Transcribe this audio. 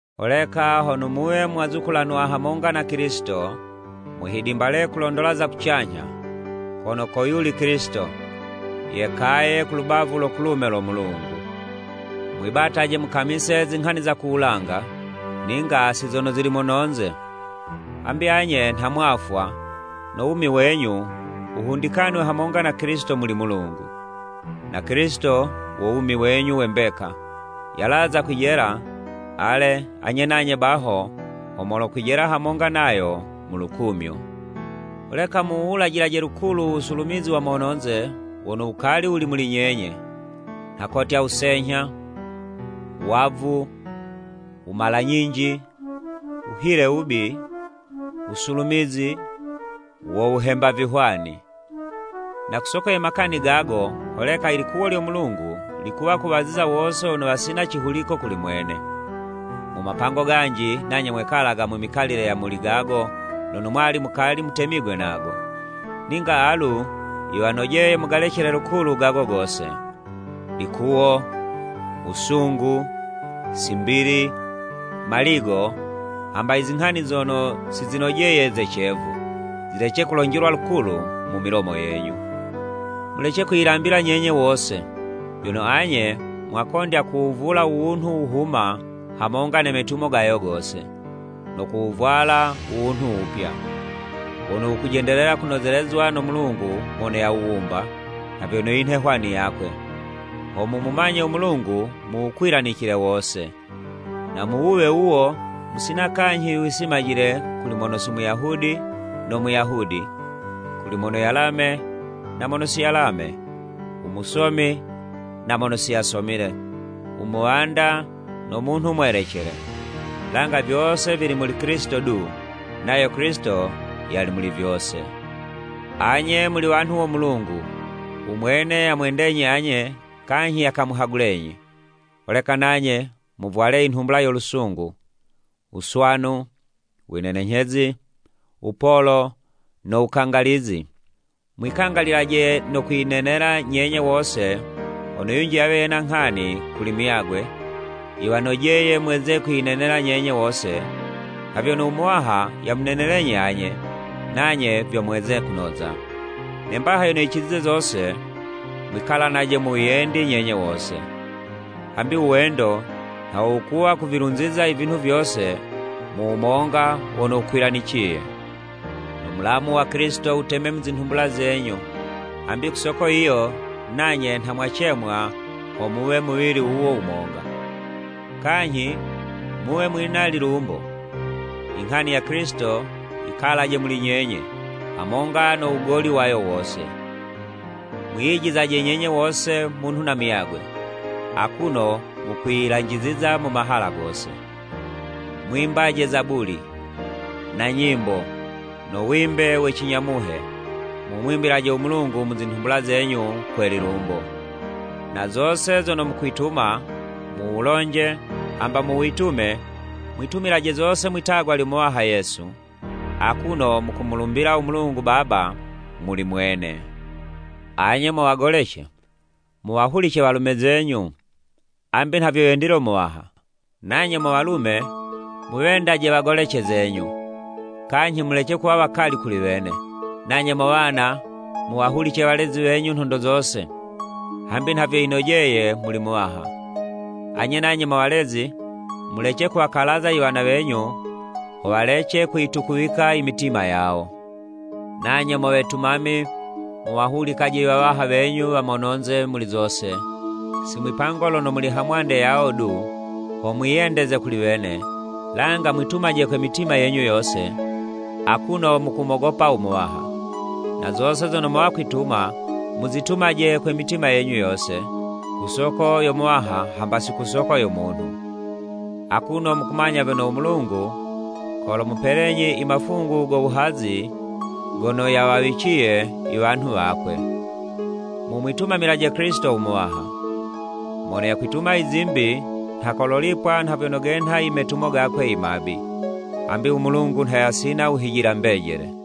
Holeka hono muwe mwazukulanwa hamonga na Kilisito, muhidimbale kulondola za kucanyha, kono ko yuli Kilisito, yekaye ku lubavu lo kulume lo Mulungu. Mwibataje mukamise zinghani za ku wulanga, ninga si zono zili mono'nze. Hambi anye nha mwafwa, no wumi wenyu wuhundikanwe hamonga na Kilisito muli Mulungu. Na Kilisito wo wumi wenyu we mbeka, yalaza kwijela, ale, anye nanye baho ho molokwijela hamonga nayo mu lukumyo. Holeka muwuwulajilaje lukulu u wusulumizi wa mono'nze wono wukali wuli muli nyenye, nha kotya, wusenyha, wavu, wumala-nyinji, wuhile wubi, wusulumizi, wo wuhemba vihwani. Na ku soko ye makani gago, holeka i likuwo lyo Mulungu likuwa kuwaziza wose wono wasina cihuliko kuli mwene. Mu mapango ganji, nanye mwekalaga mu mikalile ya muli gago lono mwali mukali mutemigwe nago. Ninga alu yiwanojeye mugalecele lukulu gago gose, likuwo, wusungu, simbili, maligo, hamba i zinghani zono si zinojeye ze cevu, zilece kulonjelwa lukulu mu milomo yenyu. Mulece kwiyilambila nyenye wose, vyono anye mwakondya kuwuvula u wunhu wuhuma hamonga ne metumo gayo gose, no kuwuvwala u wunhu wupya. Wono wukujendelela kunozelezwa no Mulungu mono yawuwumba, nha vyono yinhe hwani yakwe, ho mumumanye u Mulungu mu wukwilanicile wose. Na mu wuwe wuwo, musina kanyhi wisimajile kuli mono si Muyahudi no Muyahudi, kuli mono yalame na mono si yalame, u musomi na mono si yasomile, u muwanda no munhu mwelecele. Langa vyose vili muli Kilisito du, nayo Kilisito yali muli vyose. Anye muli wanhu wo Mulungu, u mwene yamwendenyi anye kanyhi yakamuhagulenyi. Holeka nanye muvwale i nhumbula yo lusungu, wuswanu, winenenyhezi, wupolo, no wukangalizi. Mwikangalilaje no kwinenela nyenye wose hono yunji yawe yena nghani kuli muyagwe, yiwanojeye mweze kwiyinenela nyenye wose nha vyono u Muwaha yamunenelenyi anye, nanye vyo mweze kunoza. Ne mbaha yono yicizize zose, mwikalanaje mu wiyendi nyenye wose. Hambi u wendo nha wo wukuwa kuvilunziza i vinhu vyose mu wumonga wono wukwilaniciye. No mulamu wa Kilisito wuteme mu zinhumbula zenyu, hambi ku soko yiyo, nanye nha mwacemwa ho muwe muwili wuwo wumonga. Kanyhi muwe mwina lilumbo! I nghani ya Kilisito yikalaje muli nyenye, hamonga no wugoli wayo wose. Mwiyijizaje nyenye wose munhu na muyagwe, akuno mukwiyilanjiziza mu mahala gose. Mwimbaje Zabuli, na nyimbo, no wimbe we cinya Muhe, mumwimbilaje u Mulungu mu zinhumbula zenyu kwe lilumbo. Na zose zono mukwituma, mu wulonje, hamba mu witume, mwitumilaje zose mwitagwa lyo Muwaha Yesu, akuno mukumulumbila u Mulungu Baba muli mwene. Anye mo wagolece, muwahulice walume zenyu, hambi nha vyo yendile u Muwaha. Nanye mo walume, muwendaje wagolece zenyu, kanyhi mulece kuwa wakali kuli wene. Nanye mo wana muwahulice walezi wenyu nhondo zose, hambi nha vyo yinojeye muli Muwaha. Anye nanye mo walezi, mulece kuwakalaza i wana wenyu ho walece kuyitukuwika i mitima yawo. Nanye mo wetumami, muwahulikaje i wawaha wenyu wa mononze muli zose, si mwipango lono muli hamwande yawo du ho mwiyendeze kuli wene, langa mwitumaje kwe mitima yenyu yose, akuno mukumogopa u Muwaha. Na zose zono mowa kwituma, muzitumaje kwe mitima yenyu yose, ku soko yo Muwaha hamba si ku soko ya munhu. Akuno mukumanya vyono u Mulungu kolomupelenyi i mafungu go wuhazi gono yawawiciye i wanhu wakwe. Mumwitumamilaje Kilisito u Muwaha! Mono yakwituma i zimbi, nha kololipwa nha vyono genha i metumo gakwe i mabi. Hambi u Mulungu nha yasina wuhijila mbejele.